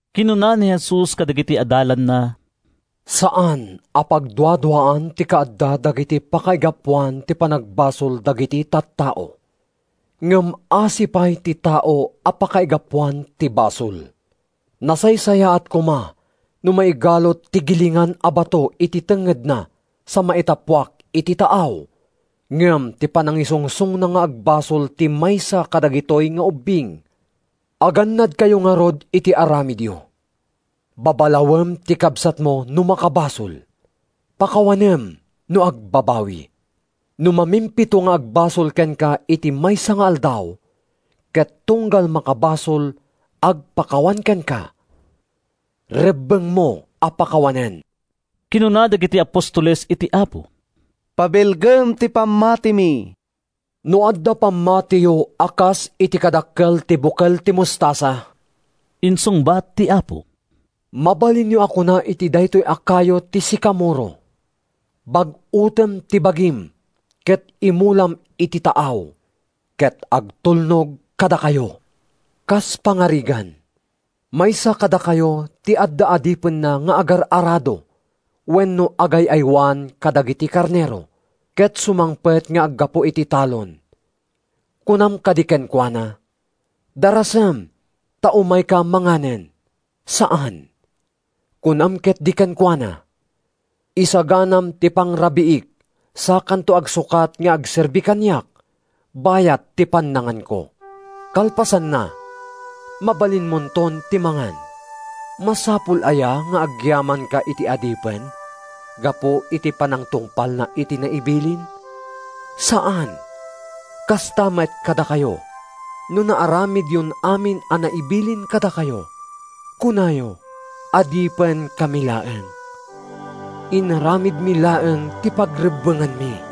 Kinuna ni Jesus kadagiti adalanna, “Saan a pagduaduaan ti kaadda dagiti pakaigapuan ti panagbasol dagiti tattao. Ngem asi pay ti tao a pakaigapuan ti basol! Nasaysayaat koma no maigalut ti gilingan a bato iti tengngedna sa maitappuak iti taaw, ngem ti panangisungsongna nga agbasol ti maysa kadagitoy nga ubbing. Agannadkayo ngarud iti aramidyo! “Babalawem ti kabsatmo no makabasol. Pakawanem no agbabawi. No mamimpito nga agbasol kenka iti maysa nga aldaw, ket tunggal makabasol agpakawan kenka, rebbengmo a pakawanen.” Kinuna dagiti apostoles iti Apo, “Pabilgem ti pammatimi.” “No adda pammatiyo a kas iti kadakkel ti bukel ti mostasa,” insungbat ti Apo, “mabalinyo a kuna iti daytoy a kayo ti sikamoro, ‘Bag-utem ti bagim ket imulam iti taaw,’ ket agtulnog kadakayo.” “Kas pangarigan, maysa kadakayo ti adda adipenna nga agar-arado wenno agay-aywan kadagiti karnero, ket sumangpet nga aggapu iti talon, kunam kadi kenkuana, ‘Darasem ta umayka manganen?’ Saan! Kunam ketdi kenkuana, ‘Isaganam ti pangrabiik sakanto agsukat nga agserbi kaniak bayat ti pannanganko. Kalpasanna, mabalinmonton ti mangan.’ “Masapul aya nga agyamanka iti adipen gapu iti panangtungpalna iti naibilin? Saan! Kasta met kadakayo: No naaramidyon amin a naibilin kadakayo, kunayo, ‘Adipenkami laeng. Inaramidmi laeng ti pagrebbenganmi.’”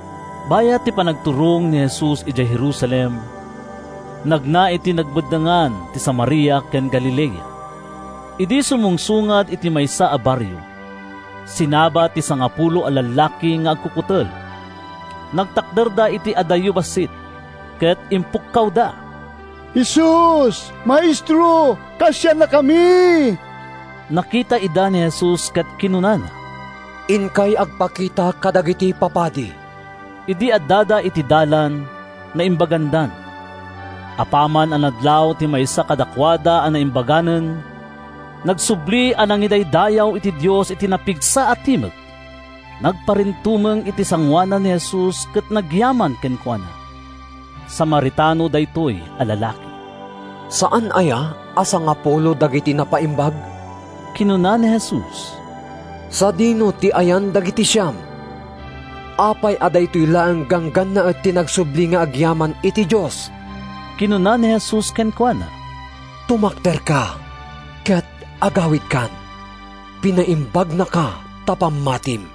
Bayat ti panagturong ni Jesus idiay Jerusalem, nagna iti nagbeddengan ti Samaria ken Galilea. Idi sumungsungad iti maysa a barrio, sinabat ti sangapulo a lallaki nga agkukutel. Nagtakderda iti adayo bassit ket impukkawda, “Jesus, Maestro, kaasiannakami!” Nakita ida ni Jesus ket kinunana, “Inkay agpakita kadagiti papadi.” Idi addada iti dalan, naimbagandan. Apaman a nadlaw ti maysa kadakuada a naimbaganen, nagsubli a nangidaydayaw iti Dios iti napigsa a timek. Nagparintumeng iti sangoanan ni Jesus ket nagyaman kenkuana. Samaritano daytoy a lalaki. “Saan aya a sangapulo dagiti napaimbag?” kinuna ni Jesus. “Sadino ti ayan dagiti siam? Apay a daytoy laeng ganggannaet ti nagsubli nga agyaman iti Dios?” Kinuna ni Jesus kenkuana, “Tumakderka ket agawidkan. Pinaimbagnaka ta pammatim.”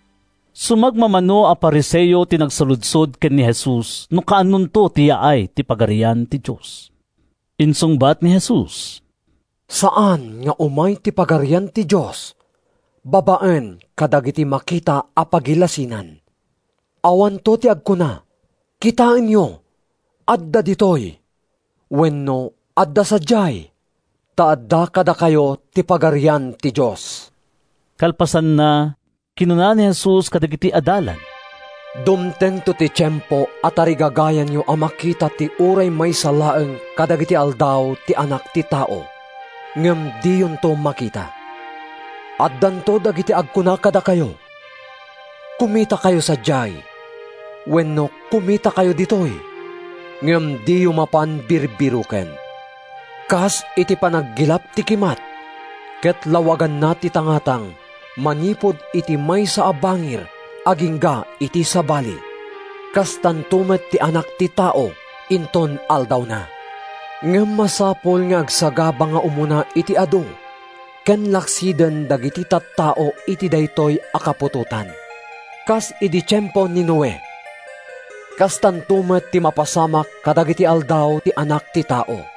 Sumagmamano a Fariseo ti nangsaludsod ken ni Jesus no kaanonto ti yaay ti Pagarian ti Dios. Insungbat ni Jesus, “Saan nga umay ti Pagarian ti Dios babaen kadagiti makita a pagilasinan. Awanto ti agkuna, ‘Kitaenyo, adda ditoy!’ wenno ‘Adda sadiay!’ Ta adda kadakayo ti Pagarian ti Dios.” Kalpasanna, kinuna ni Jesus kadagiti adalan, “Dumtengto ti tiempo a tarigagayanyo a makita ti uray maysa laeng kadagiti aldaw ti Anak ti Tao, ngem diyonto makita. “Addanto dagiti agkuna kadakayo, ‘Kumitakayo sadiay!’ wenno ‘Kumitakayo ditoy!’ Ngem diyo mapan birbiroken. Kas iti panaggilap ti kimat ket lawaganna ti tangatang manipud iti maysa a bangir agingga iti sabali, kastanto met ti Anak ti Tao inton aldawna. Ngem masapul nga agsagaba nga umuna iti adu ken laksiden dagiti tattao iti daytoy a kaputotan. Kas idi tiempo ni Noe, kastanto met ti mapasamak kadagiti aldaw ti Anak ti Tao.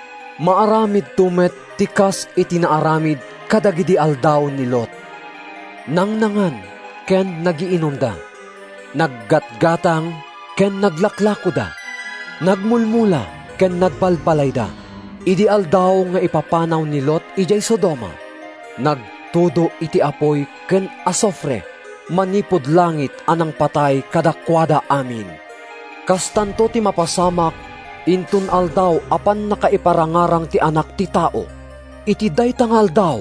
Maaramidto met ti kas iti naaramid kadagidi aldaw ni Lot. Nangnangan ken nagiinumda. Naggatgatang ken naglaklakoda. Nagmulmula ken nagbalbalayda. Idi aldaw nga ipapanaw ni Lot idiay Sodoma, nagtudo iti apuy ken asufre manipud langit a nangpatay kadakuada amin. Kastanto ti mapasamak inton aldaw a pannakaiparangarang ti Anak ti Tao. “Iti dayta nga aldaw,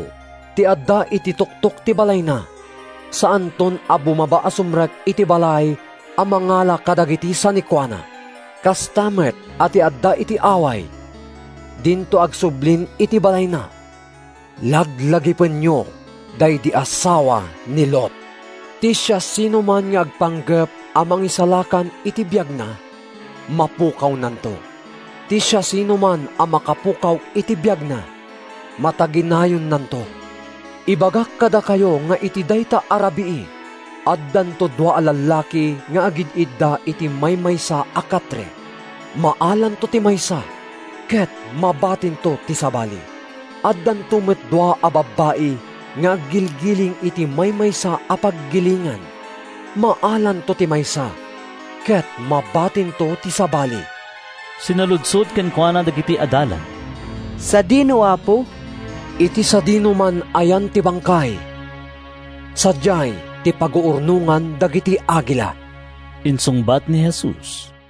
ti adda iti tuktok ti balayna saanton a bumaba a sumrek iti balay a mangala kadagiti sanikuana. Kasta met a ti adda iti away dinto agsublin iti balayna. “Laglagipenyo daydi asawa ni Lot! “Ti siasinoman nga agpanggep a mangisalakan iti biagna, mapukawnanto. Ti siasinoman a makapukaw iti biagna, mataginayonnanto. “Ibagak kadakayo nga iti dayta a rabii, addanto dua a lallaki nga agid-idda iti maymaysa a katre. Maalanto ti maysa ket mabatinto ti sabali. Addanto met dua a babbai nga aggilgiling iti maymaysa a paggilingan. Maalanto ti maysa ket mabatinto ti sabali.” Sinaludsod kenkuana dagiti adalan, “Sadino, Apo?” “Iti sadinoman a yan ti bangkay, sadiay ti paguurnongan dagiti agila,” insungbat ni Jesus.